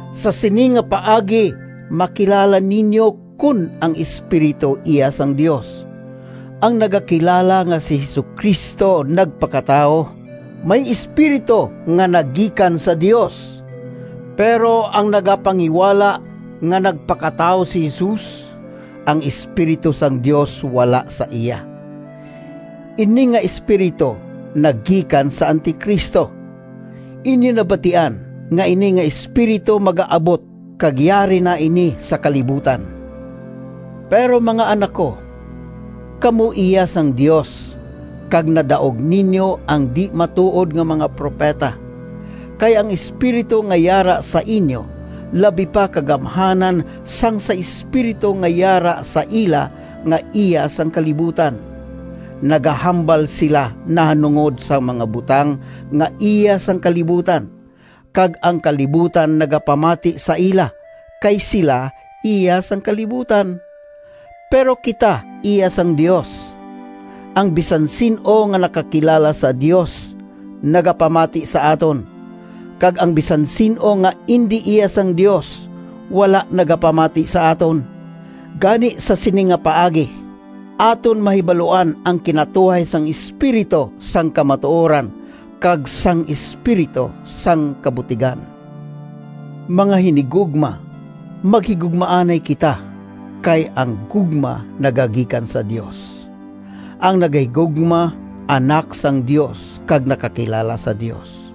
Sa sini nga paagi makilala ninyo kon ang Espiritu iya sang Dios: ang nagakilala nga si Jesu-Cristo nagpakatawo, may Espiritu nga nagikan sa Dios. Pero ang nagapanghiwala nga nagpakatawo si Jesus, ang Espiritu sang Dios wala sa iya. Ini nga espiritu nagikan sa Anti-Cristo. Inyo nabatian nga ini nga espiritu magaabot kag yari na ini sa kalibutan. Pero, mga anak ko, kamo iya sang Dios, kag nadaog ninyo ang di-matuod nga mga propeta, kay ang Espiritu nga yara sa inyo labi pa ka gamhanan sang sa espiritu nga yara sa ila nga iya sang kalibutan. Nagahambal sila nahanungod sang mga butang nga iya sang kalibutan, kag ang kalibutan nagapamati sa ila, kay sila iya sang kalibutan. Pero kita iya sang Dios. Ang bisan sin-o nga nakakilala sa Dios nagapamati sa aton, kag ang bisan sin-o nga indi iya sang Dios, wala nagapamati sa aton. Gani sa sini nga paagi, aton mahibaluan ang kinatuhay sang Espiritu sang kamatuoran kag sang espiritu sang kabutigan. Mga hinigugma, maghigugmaanay kita, kay ang gugma nagagikan sa Dios. Ang nagahigugma anak sang Dios kag nakakilala sa Dios.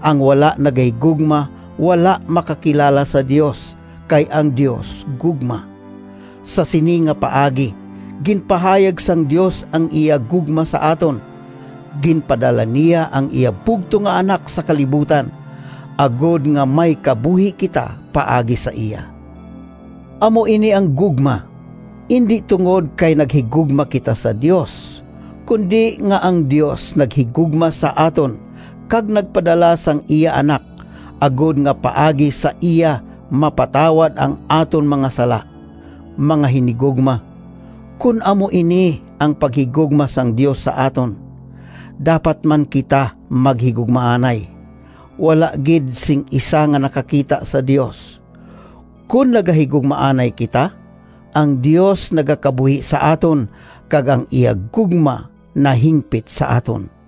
Ang wala nagahigugma wala makakilala sa Dios, kay ang Dios gugma. Sa sini nga paagi ginpahayag sang Dios ang iya gugma sa aton: ginpadala niya ang iya bugtong nga Anak sa kalibutan agod nga may kabuhi kita paagi sa iya. Amo ini ang gugma: indi tungod kay naghigugma kita sa Dios, kundi nga ang Dios naghigugma sa aton kag nagpadala sang iya Anak agod nga paagi sa iya mapatawad ang aton mga sala. Mga hinigugma, kon amo ini ang paghigugma sang Dios sa aton, dapat man kita maghigugmaanay. Wala gid sing isa nga nakakita sa Dios. Kon nagahigugmaanay kita, ang Dios nagakabuhi sa aton kag ang iya gugma nahimpit sa aton.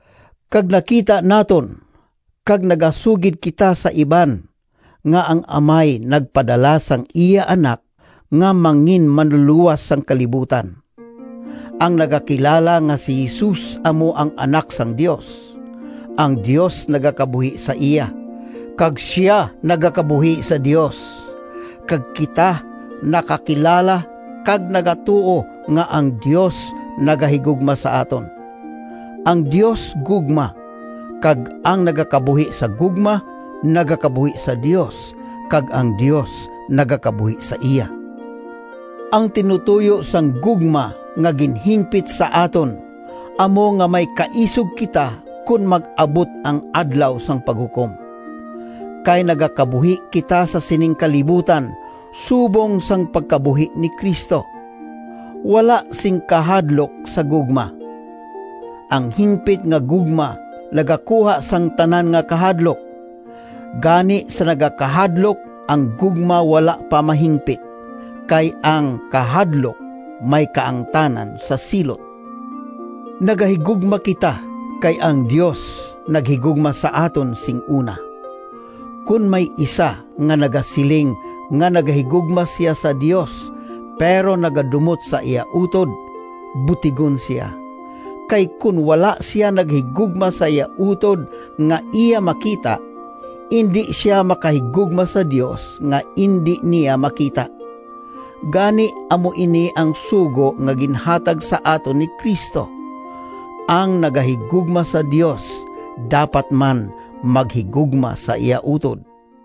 Kag nakita naton kag nagasugid kita sa iban nga ang Amay nagpadala sang iya Anak nga mangin-Manlulowas sang kalibutan. Ang nagakilala nga si Jesus amo ang Anak sang Dios, ang Dios nagakabuhi sa iya, kag sia nagakabuhi sa Dios. Kag kita nakakilala kag nagatuo nga ang Dios nagahigugma sa aton. Ang Dios gugma, kag ang nagakabuhi sa gugma, nagakabuhi sa Dios kag ang Dios nagakabuhi sa iya. Ang tinutoyo sang gugma nga ginhimpit sa aton amo nga may kaisog kita kon mag-abot ang Adlaw sang Paghukom, kay nagakabuhi kita sa sining kalibutan subong sang pagkabuhi ni Cristo. Wala sing kahadlok sa gugma. Ang himpit nga gugma nagakuha sang tanan nga kahadlok. Gani sa nagakahadlok ang gugma wala pa mahimpit, kay ang kahadlok may kaangtanan sa silot. Nagahigugma kita, kay ang Dios naghigugma sa aton sing una. Kon may isa nga nagasiling nga nagahigugma sia sa Dios, pero nagadumot sa iya utod, butigon sia. Kay kon wala sia nagahigugma sa iya utod nga iya makita, indi sia makahigugma sa Dios nga indi niya makita. Gani amo ini ang sugo nga ginhatag sa aton ni Cristo: ang nagahigugma sa Dios dapat man maghigugma sa iya utod.